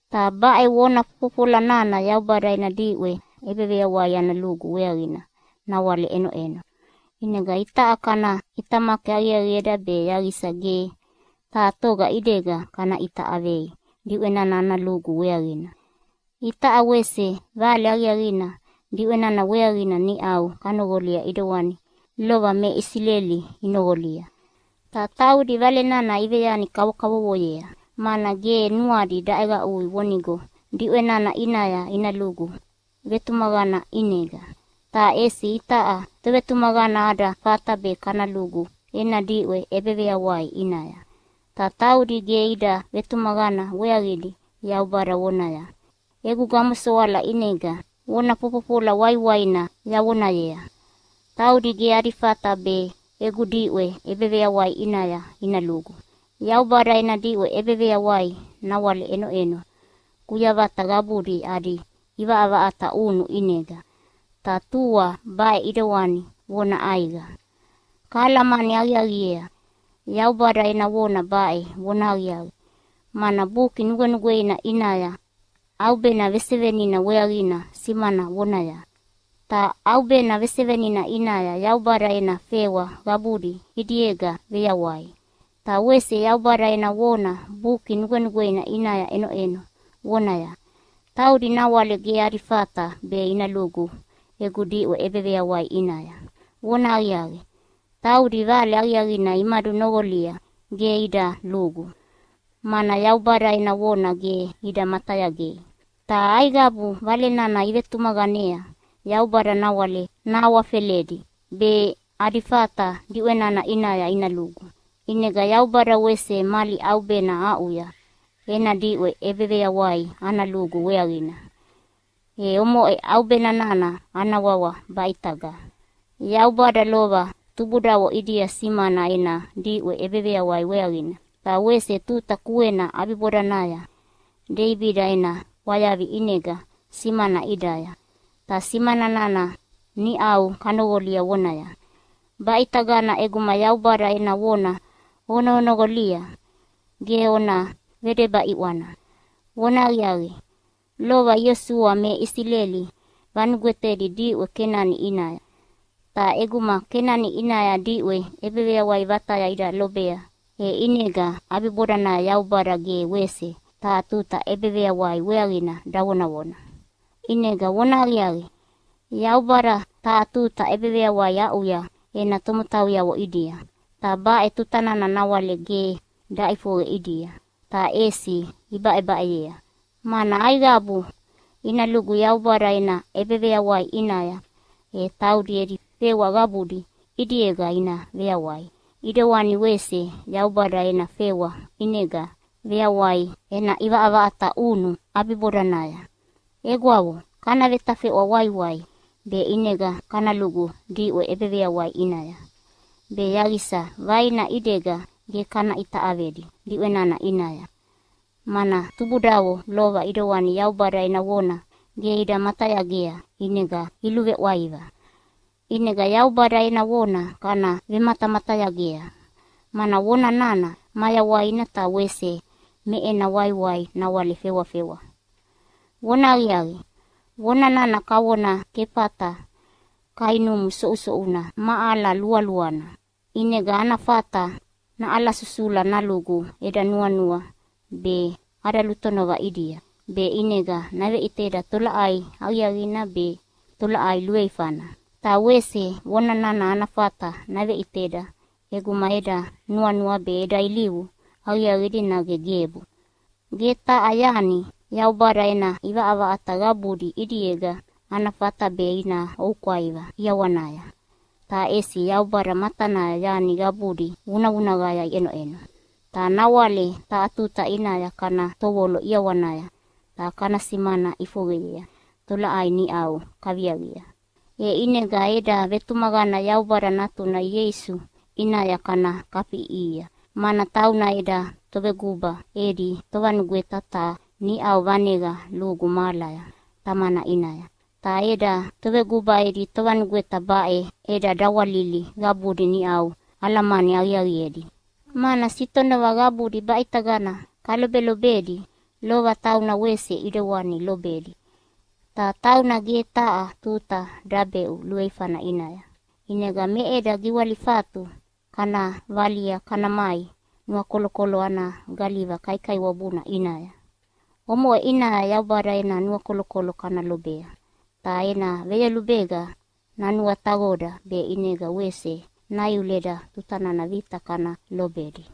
Ta baʼe vona fofofola nana Yaubada ena diʼwe ʼebeveyawai ana lugu weaqina nawale ʼenoʼeno. ʼInega itaʼa kana ʼitamaki aqiaqieda be yaqisa ge taha toga ʼidega kana ʼita ʼavei diʼwe nana ana lugu weaqina. Itaʼa wese Vale Aqiaqina diʼwe nana weaqina niʼau kanoqolia ʼidewani lova me Isileli inoqolia. Ta taudi Vale nana iveyani kavokavovoyea, mana ge nuadi daʼeqaʼui vonigo diʼwe nana ʼinaya ina lugu vetumaqana ʼinega. Ta ʼesi itaʼa tovetumaqana ada fata be kana lugu ena diʼwe ʼebeveyawai ʼinaya. Ta taudi ge ida vetumaqana weaqidi Yaubada vonaya, “Egu gamosoala ʼinega vona fofofola waiwaina yavonayea, ‘Taudi ge adi fata be egu diʼwe ʼebeveyawai ʼinaya ina lugu!’” Yaubada ena diʼwe ʼebeveyawai nawale ʼenoʼeno kuyavata qabudi adi ʼivaʼavaʼata ʼunu ʼinega, ta tua baʼe ʼidewani vona ʼaiqa. Kahalamani aqiaqiea Yaubada ena vona baʼe vonahaqiaqi, mana Buki Nugwenugweina ʼinaya ʼaubena vesevenina weaqina simana vonaya, “Ta ʼaubena vesevenina ʼinaya Yaubada ena fewa qabudi ʼidiega veyawai.” Ta wese Yaubada ena vona Buki Nugwenugweina ʼinaya ʼenoʼeno vonaya, “Taudi nawale ge adi fata be ina lugu egu diʼwe ʼebeveyawai ʼinaya.” Vonahaqiaqi, taudi Vale Aqiaqina imadunoqolia ge ida lugu, mana Yaubada ena vona ge ida matayagei. Ta aiqabu Vale nana ivetumaqanea Yaubada nawale nahawafeledi be adi fata diʼwe nana ʼinaya ina lugu. ʼInega Yaubada wese mali ʼaubena aʼuya ena diʼwe ʼebeveyawai ana lugu weaqina, e omoʼe ʼaubena nana ana wawa “Baʼitaga.” Yaubada lova tubudavo ʼidia simana ena diʼwe ʼebeveyawai weaqina, ta wese tuta kuena ʼabibodanaya Deibida ena ʼwayavi ʼinega simana ʼidaya, ta simana nana niʼau kanoqolia vonaya, “Baʼitagana ʼeguma Yaubada ena vona onoqonoqolia ge ona vedeba ʼiʼwana!” Vonahaqiaqi, lova Iosua me Isileli vanugwetedi diʼwe Kenani ʼinaya. Ta ʼeguma Kenani ʼinaya diʼwe ʼebeveyawai vataya ida lobea, e ʼinega ʼabibodanaya Yaubada ge wese taha tuta ʼebeveyawai weaqina davonavona. ʼInega vonahaqiaqi, Yaubada taha tuta ʼebeveyawai aʼuya ena tomotauyavo ʼidia, ta baʼe tuta nana nawale ge daʼifoqe ʼidia, ta ʼesi ibaʼebaʼeyea. Mana aiqabu ina lugu Yaubada ena ʼebeveyawai ʼinaya, e taudi edi fewa qabudi ʼidiega ina veyawai, ʼidewani wese Yaubada ena fewa ʼinega veyawai ena ʼivaʼavaʼata ʼunu ʼabibodanaya. Egwavo, kana vetafeʼwa waiwai be ʼinega kana lugu diʼwe ʼebeveyawai ʼinaya, be yaqisa vaina ʼidega ge kana ʼita ʼavedi diʼwe nana ʼinaya, mana tubudavo lova ʼidewani Yaubada ena vona ge ida matayagea ʼinega iluveʼwaiva. ʼInega Yaubada ena vona kana vematamatayagea, mana vona nana mayawaina ta wese me ena waiwai nawale fewafewa. Vonahaqiaqi, vona nana kavona kefata kainumu soʼusoʼuna ma ala lualuana, ʼinega ana fata naʼalasusula nalugu eda nuanua be ada lutonova ʼidia, be ʼinega naveʼiteda tolaʼai aqiaqina be tolaʼai luveifana. Ta wese vona nana ana fata naveʼiteda ʼeguma eda nuanua be eda ilivu aqiaqidi nage gebu. Ge taha yani Yaubada ena ʼivaʼavaʼata qabudi ʼidiega ana fata be ina oukwaiva ʼiawanaya, ta ʼesi Yaubada matanaya yani qabudi vunavunaqaya iʼenoʼeno. Ta nawale taha tuta ʼinaya kana tovolo ʼiawanaya ta kana simana ʼifoqeyea tolaʼai niʼau kaviaqia. E ʼinega eda vetumaqana Yaubada Natuna Ieisu ʼinaya kana kafiʼiʼihia, mana tauna eda Toveguba edi Tovanugweta ta niʼau vaneqa lugu mahalaya Tamana ʼinaya. Ta eda Toveguba edi Tovanugweta baʼe eda dawalili qabudi niʼau alamani aqiaqiedi, mana sitonova qabudi baʼitagana kalobelobedi lova tauna wese ʼidewani lobedi. Ta tauna ge taha tuta dabeʼu luveifana ʼinaya. ʼInega me eda giwalifatu kana valia kana mai nuakolokolo ana galiva kaikaiwabuna ʼinaya. Omoʼe ʼinaya Yaubada ena nuakolokolo kana lobea, ta ena veyolubega nanuataqoda be ʼinega wese naiuleda tuta nana vita kana lobedi.